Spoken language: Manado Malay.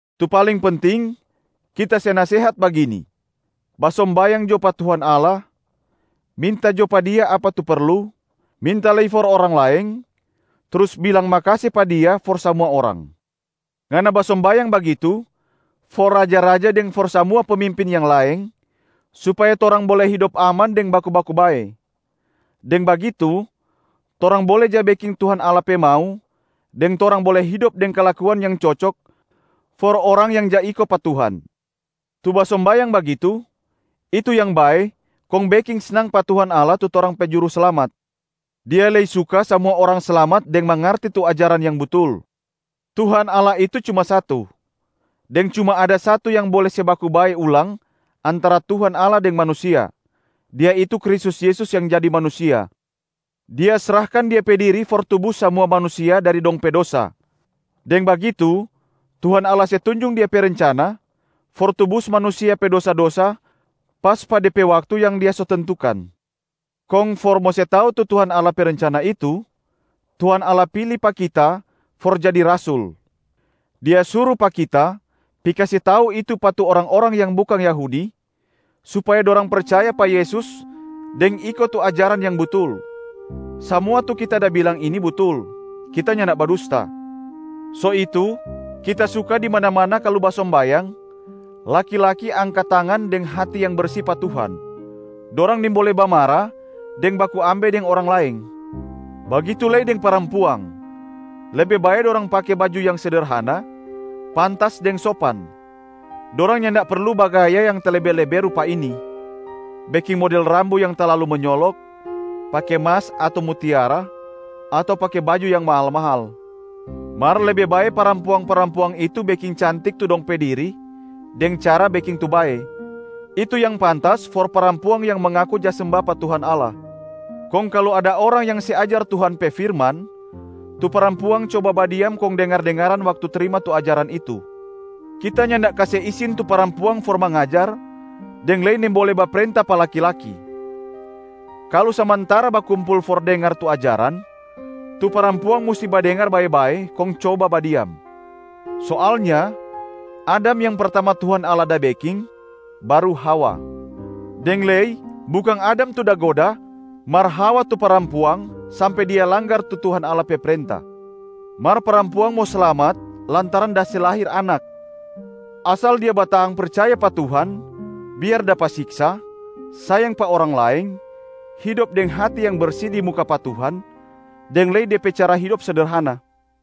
Tu paling penting, kita se nasehat bagini: basombayang jo pa Tuhan Allah, minta jo pa Dia apa tu perlu, minta lei for orang laeng, trus bilang makase pa Dia for samua orang. Ngana basombayang bagitu for raja-raja deng for samua pemimpin yang laeng, supaya torang bole hidop aman deng baku-baku bae. Deng bagitu torang bole ja beking Tuhan Allah pe mau deng torang bole hidop deng kalakuan yang cocok for orang yang ja iko pa Tuhan. Tu basombayang bagitu, itu yang bae kong beking snang pa Tuhan Allah tu torang pe Juruslamat. Dia lei suka samua orang slamat deng mangarti tu ajaran yang butul. Tuhan Allah itu cuma satu, deng cuma ada satu yang bole se baku bae ulang antara Tuhan Allah deng manusia, Dia itu Kristus Yesus yang jadi manusia. Dia srahkan Dia pe diri for tubus samua manusia dari dong pe dosa. Deng bagitu Tuhan Allah se tunjung Dia pe rencana for tubus manusia pe dosa-dosa pas pa de pe waktu yang Dia so tentukan. Kong for mo kase tau tu Tuhan Allah pe rencana itu, Tuhan Allah pili pa kita for jadi rasul. Dia suru pa kita pi kase tau itu pa tu orang-orang yang bukang Yahudi supaya dorang percaya pa Yesus deng iko tu ajaran yang butul. Samua tu kita da bilang ini butul, kita nyanda badusta. So itu kita suka di mana-mana kalu basombayang, laki-laki angka tangan deng hati yang bersi pa Tuhan. Dorang nimbole bamara deng baku ambe deng orang laeng. Bagitu lei deng parampuang, lebe bae dorang pake baju yang sederhana, pantas deng sopan. Dorang nyanda perlu bagaya yang talebe-lebe rupa ini: beking model rambu yang talalu menyoloka, pake mas ato mutiara, ato pake baju yang mahal-mahal. Mar lebe bae parampuang-parampuang itu beking cantik tu dong de pe diri deng cara beking tu bae. Itu yang pantas for parampuang yang mangaku ja semba pa Tuhan Allah. Kong kalu ada orang yang se ajar Tuhan pe firman, tu parampuang coba badiam kong dengar-dengaran waktu trima tu ajaran itu. Kita nyanda kase isin tu parampuang for mangajar deng lei nimbole baprenta pa laki-laki. Kalu samantara bakumpul for dengar tu ajaran, tu parampuang musti badengar bae-bae kong coba badiam. Soalnya, Adam yang pertama Tuhan Allah da beking baru Hawa. Deng lei bukang Adam tu da goda mar Hawa tu parampuang sampe dia langgar tu Tuhan Allah pe prenta. Mar parampuang mo slamat lantaran da se lahir anakb, asal dia batahang percaya pa Tuhan biar dapa siksa, sayang pa orang laeng, hidop deng hati yang bersi di muka pa Tuhan, deng lei de pe cara hidop sederhana.